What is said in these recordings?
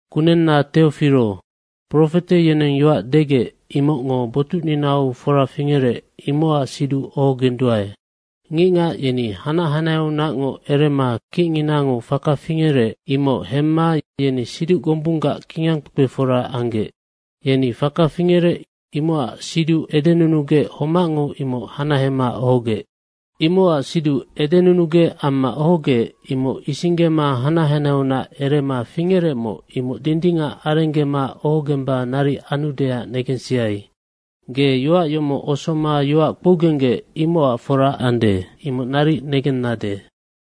Kunenna Teofiro, profete yeneng yoac degec, imocngo botucninau fora fingerec, imocac siduc ohogenduae. Ngicngac yeni hanac hanaheaunacngoc erema kicnginango faka fingerec, imoc hemma yeni siduc gombunggac kingangkpekpefora anggec. Yeni faka fingerec, imocac siduc edenunugec homacngo imoc hanahema ohogec. Imocac siduc edenunugec amma ohogec, imoc isinggema hanac hanaheaunac erema fingerecmoc, imoc dindingac arenggema ohogemba naric anudeac negensiai. Ge yoac yomoc osoma yoac kpougenggec, imocac fora ande, imoc naric negennade.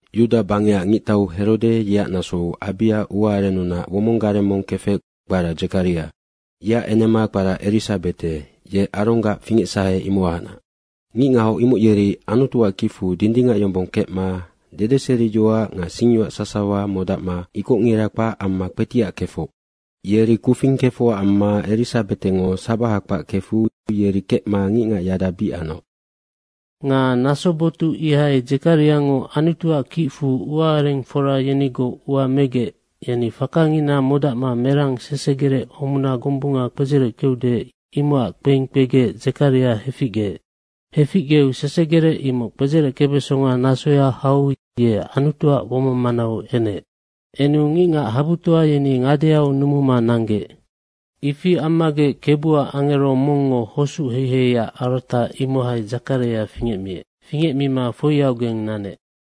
Yuda bangecac ngictau Herode yeac nasou Abia ua arennunac womong gareng mong kefec, kpara Dzekaria. Yeac enema kpara Erisabete ye Aronggac fingecsahe, imohacnac. Ngicngahoc imoc yeri Anutuac kicfu dindingac yombong kecma dedeseriyoac nga singyoac sasawa modacma ikocngira kpac amma kpetiac kefoc. Yeri kufing kefocac amma Erisabetengo sabaha kpac kefu yeri kecma ngicngac yada bic anoc. Nga naso botuc ihai Dzekariango Anutuac kicfu uaarengfora yenigoc ua megec yeni fakangina modacma merang sesegerec homuna gombunga kpedzereckeude, imocac kpeing kpegec Dzekaria heficgeec. Heficgeu sesegerec imoc kpedzereckebesonga nasoya hau ye Anutuac womong manau enec. Enu ngicngac habutoa yeni ngadeau numuma nanggec. Ifi ammagec Kebuac angero mongngo hosuc heiheiac arata, imohai Dzekaria fingecmiec. Fingecmima foiaugeng nanec.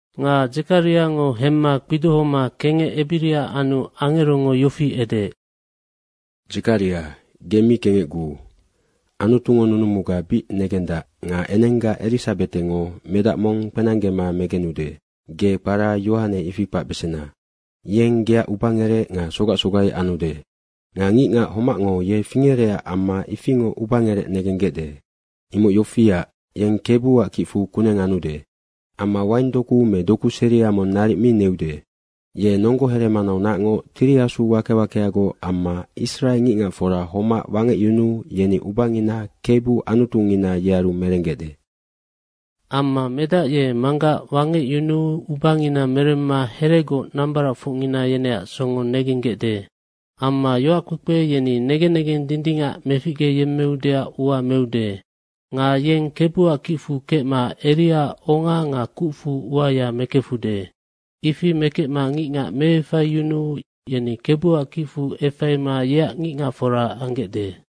Nga Dzekariango hemma kpidohoma kengec ebiria anu angerongo yofi edeec, “Dzekaria, ge mi kengecguu, Anutungo nunumuga bic negendac nga enengga Erisabetengo medac mong kpenanggema megenude. Ge kpara Yohane, ifi kpacbesena. Yeng geac ubangerec nga sogac sogai anude. Nga ngicngac homacngo ye fingerecac amma ifingoc ubangerec negenggecde. Imoc yofiac, yeng Kebuac kicfu kuneng anude. Amma waing doku me doku seria mong naric mi neude. Ye nonggo heremanaunacngoc Tiri Asu wake wakeagoc amma Israe ngicngacfora homac wangecyunuu yeni ubangina Kebu Anutungina, yearu merenggecde. Amma medac ye manggac wangecyunuu ubangina meremma heregoc nambaracfocngina yeneac songo negenggecde. Amma yoackpekpe yeni negen negeng dindingac meficgeyemmeudeac ua meude. Nga yeng Kebuac kicfu kecma Eriaac onga nga kucfu uaya mekefude. Ifi mekecma ngicngac meefaiyunuu yeni Kebuac kicfu efaima yeac ngicngacfora anggecde.”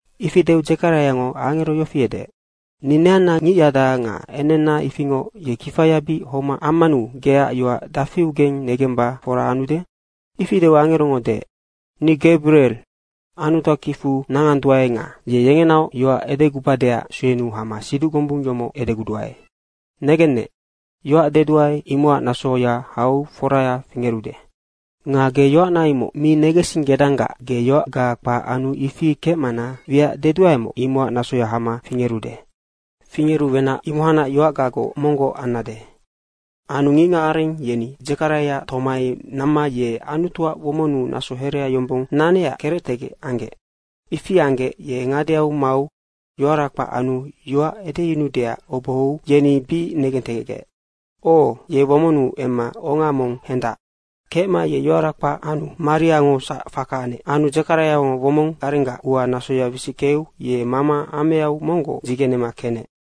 Ifi deu Dzekariango angero yofi edeec, “Ni neanna ngicyada nga enenna ifingoc, ye kifaya bic homac ammanu geac yoac dafiugeng negemba fora anude?” Ifi deu angerongo deec, “Ni Gabirie. Anutuac kicfu nanganduae nga ye yengenaoc yoac edegubadeac suenuu hama siduc gombung yomoc edeguduae. Negennec, yoac deduae, imocac nasoya hau foraya fingerude. Nga ge yoacna imoc mi negensinggedanggac ge yoacga kpac anu ifi kecmana wiac deduaemoc, imocac nasoya hama fingerude. Fingeru wenac imohaingoc yoacgagoc monggoc annade.” Anu ngicngacareng yeni Dzekariaac tomai namma ye Anutuac womonnu naso herea yombong nanecac kerectegec anggec. Ifi anggec ye ngadeau mau yoara kpac anu yoac edeyunuudeac obohou yeni bic negentegecgec, “O, ye womonnu emma onga mong hendac.” Kecma ye yoara kpac anu mariangosac faka anec. Anu Dzekariaac womong garenggac ua nasoya wisickeu ye mama ameau monggoc dzigenema kenec.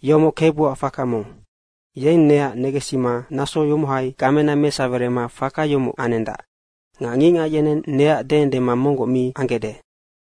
“Yomoc Kebuac faka mong, yeng neac negensima naso yomohai gamena mesawerema faka yomoc anendac. Nga ngicngac yeneng neac deendema monggoc mi anggecde.”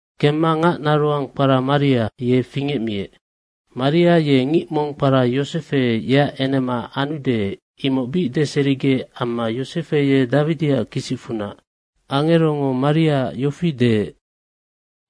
Kemma ngac naroang kpara Maria, ye fingecmiec. Maria ye ngic mong kpara Yosefe, yeac enema anude, imoc bic deserigec amma Yosefe ye Dawidiac kisicfunac. Angerongo Mariaac yofi deec,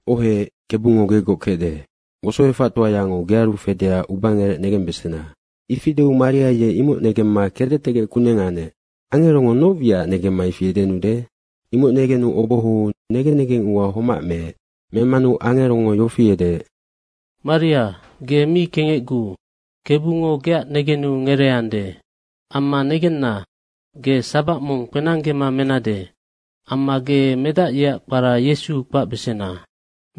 “Ohec, Kebungo gegoc kecde, wosoefactoayango gearu fedeac ubangerec negembesena.” Ifi deu Maria ye imoc negemma kerectegec kuneng anec, “Angerongo noc wiacac negemma ifi edenude?” imoc negenu obohou negen negeng ua homac meec. Memanu angerongo yofi edeec, “Maria, ge mi kengecguu, Kebungo geac negenu ngereeande. Amma negenna, ge sabac mong kpenanggema menade. Amma ge medac yeac kpara Yesu kpacbesena.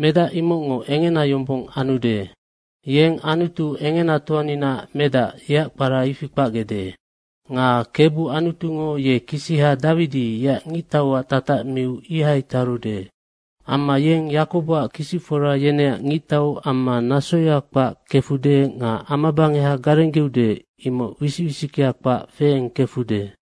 Medac imocngo engena yombong anude. Yeng Anutu Engenatoaninaac Medac, yeac kpara ifi kpacgecde. Nga Kebu Anutungo ye kisiha Dawidi yeac ngictauac tatac miu ihai tarude. Amma yeng Yakoboac kisicfora yeneac ngictau amma nasoya kpac kefude nga amabangeha garenggeude, imoc wisic wisickea kpac feeng kefude.”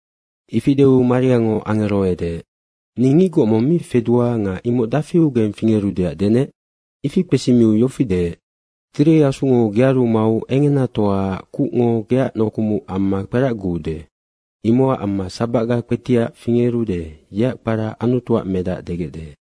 Ifi deu Mariango angero edeec, “Ni ngicgoc mong mi fedua nga imoc dafiugeng fingerudeac denec?” Ifi kpesimiu yofi deec, “Tiri Asungo gearu mau Engenatoaac kucngo geac nokumuc amma kperacguude. Imocac amma sabacga kpetiac fingerude, yeac kpara Anutuac Medac degecde.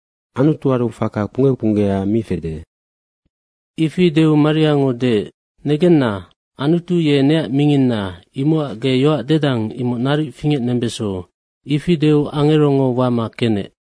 Anutuaru faka kpungge kpunggea mi fede.” Ifi deu Mariango deec, “Negenna, Anutu ye neac minginna imocac ge yoac dedang, imoc naric fingecnembeso.” Ifi deu angerongo wama kenec.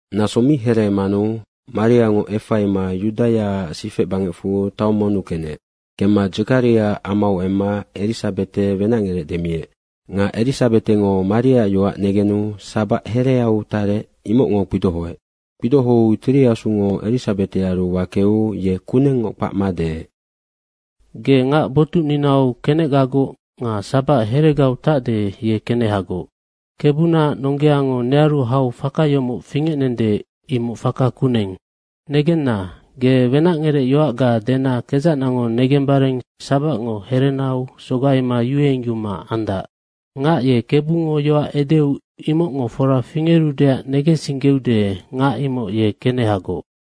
Naso mi hereemanu Mariango efaima Yudaiaac sifec bangecfu taong monnu kenec. Kemma Dzekariaac amau emma Erisabete wenacngerec demiec. Nga Erisabetengo Mariaac yoac negenu sabac hereau tarec, imocngo kpidohoec. Kpidohou Tiri Asungo Erisabetearu wakeu ye kunengngoc kpacma deec, “Ge ngac botucninau kenecgagoc nga sabac heregau tacde, ye kenehagoc. Kebunaac nonggeango nearu hau faka yomoc fingecnende, imoc faka kuneng. Negenna, ge wenacngerecyoacga dena kedzacnango negembare sabacngo herenau sogaima yuengyuma andac. Ngac ye Kebungo yoac edeu imocngo fora fingerudeac negensinggeude, ngac imoc ye kenehagoc.”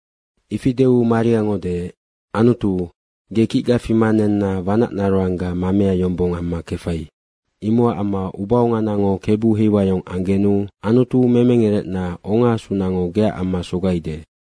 Ifi deu Mariango deec, “Anutu, ge kicga fima nenna wanac naroangga mamea yombong amma kefai. Imocac amma ubaonganango Kebu heiwayong anggenu Anutu memengerecna, ongaasunango geac amma sogaide.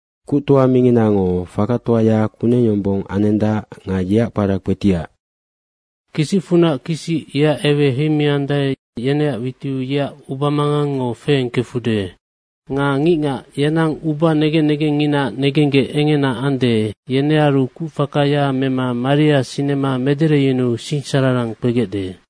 Kuctoa Minginango fakatoaya kuneng yombong anendac nga yeac kpara kpetiac. Kisicfunac kisic yeac ewea heimiandae, yeneac witiu yeac ubamangangngo feengkefude. Nga ngicngac yenang uba negen negengnginaac negenggec engena ande, yenearu kucfakaya mema maria sinema medereyunuu singsararang kpegecde.”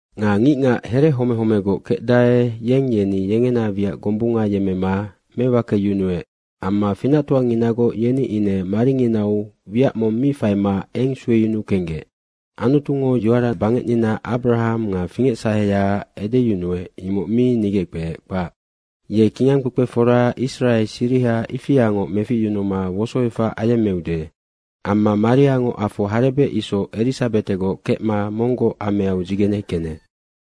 Nga ngicngac here home homegoc kecdae, yeng yeni yengena wiac gombunga yemmema mewakeyunuec amma finactoanginagoc, yeni ine maringinau wiac mong mi faima eng sueyunuu kenggec. Anutungo yoara bangecnina Abrahang nga fingecsaheyaac edeyunuec, imoc mi nigeckpeec, kpac. Ye kingangkpekpefora Israe siriha ifiangoc meficyunuma wosoefac ayemmeude.” Amma Mariango afo harebec isoc Erisabetegoc kecma monggoc ameau dzigene kenec.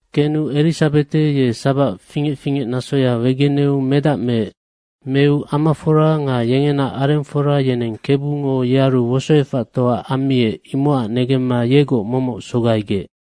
Kenu Erisabete ye sabac fingec fingec nasoya wegeneu medac meec. Meu amafora nga yengena arengfora yeneng Kebungo yearu wosoefactoa ammiec, imocac negemma yegoc momoc sogaigec.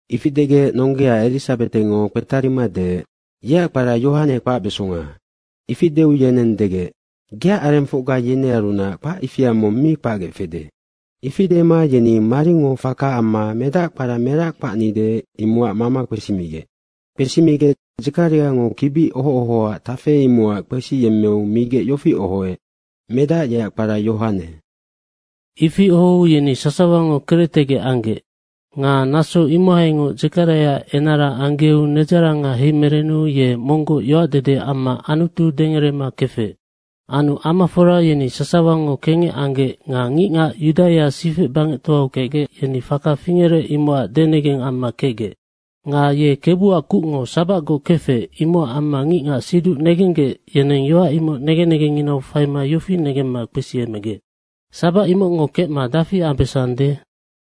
Ifi degec nonggea Erisabetengo kpetarima deec, “Yeac kpara Yohane kpacbesonga.” Ifi deu yeneng degec, “Geac arengfocga yenearunac kpac ifia mong mi kpacgec fede.” Ifi dema yeni maringo faka amma medac kpara merac kpacnide, imocac mama kpesimigec. Kpesimigec Dzekariango kibi oho ohoac tafe, imocac kpesiyemmeu migec yofi ohoec, “Medac yeac kpara Yohane.” Ifi ohou yeni sasawango kerectegec anggec. Nga naso imohaingoc Dzekariaac enara anggeu nedzaranga heimerenu ye monggoc yoacdede amma Anutu dengerema kefec. Anu amafora yeni sasawango kengec anggec nga ngicngac Yudaia sifec bangectoau kecgec, yeni faka fingerec, imocac denegeng amma kecgec. Nga ye Kebuac kucngo sabacgoc kefec, imocac amma ngicngac siduc negenggec, yeneng yoac imoc negen negenginau faima yofi negemma kpesiemegec, “Sabac imocngo kecma dafi ambesande?”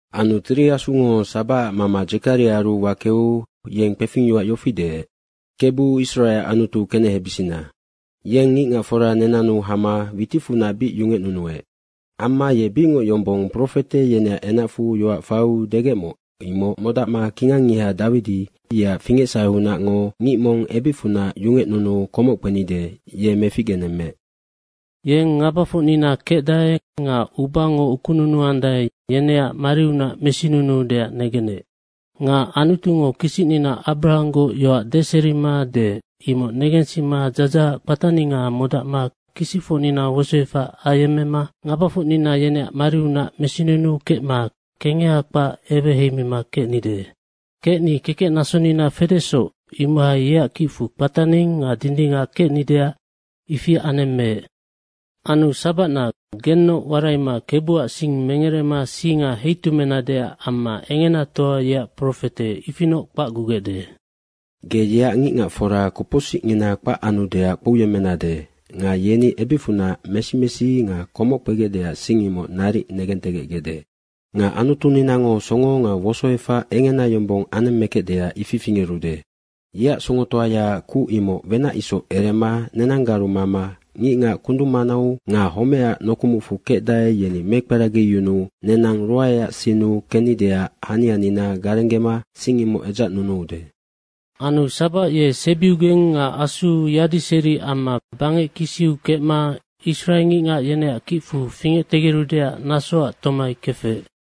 Anu Tiri Asungo sabacac mama Dzekariaaru wakeu, yeng kpefingyoac yofi deec, “Kebu Israeac Anutu kenehebisina. Yeng ngicngacfora nenannu hama witicfunac bic yungecnunuec. Amma ye bicngoc yombong profete yeneac enacfu yoac faiu degecmoc, imoc modacma kingangngiha Dawidi, yeac fingecsaheunacngo ngic mong ebicfunac yungecnunuuu komoc kpenide, ye meficgenemmeec. Yeng ngabafocnina kecdae nga ubango ukununuandae, yeneac mariunac mesinunuudeac negenec. Nga Anutungo kisicnina Abrahanggoc yoac deserima deec, imoc negensima dzadzahac kpataninga modacma kisicfocnina wosoefac ayemmema ngabafocnina yeneac mariunac mesinunuu kecma kengeha kpac eweheimima kecnide. Kecni kekecnasonina fedesoc, imohai yeac kicfu kpataning nga dindingac kecnideac ifi anemmeec. Anu sabacna gennoc waraima Kebuac sing mengerema singa heitumeinadeac amma Engenatoa yeac profete, ifinoc kpacgugecde. Ge yeac ngicngacfora kopocsicngina kpac anudeac kpouyemmenade nga yeni ebicfunac mesi mesi nga komoc kpegecdeac sing, imoc naric negentegecgecde. Nga Anutuninango songo nga wosoefac engena yombong anemmekecdeac ifi fingerude. Yeac songotoayaac kuc imoc wenac isoc erema nenanggaru mama ngicngac kundung manau nga homecac nokumucfu kecdae, yeni mekperagiyunuu nenang ruaeac sinnu kennideac hanianina garenggema sing imoc edzacnunuude.” Anu sabac ye sebiugeng nga asuu yadiseri amma bangec kisiu kecma Israe ngicngac yeneac kicfu fingectegerudeac nasoac tomai kefec.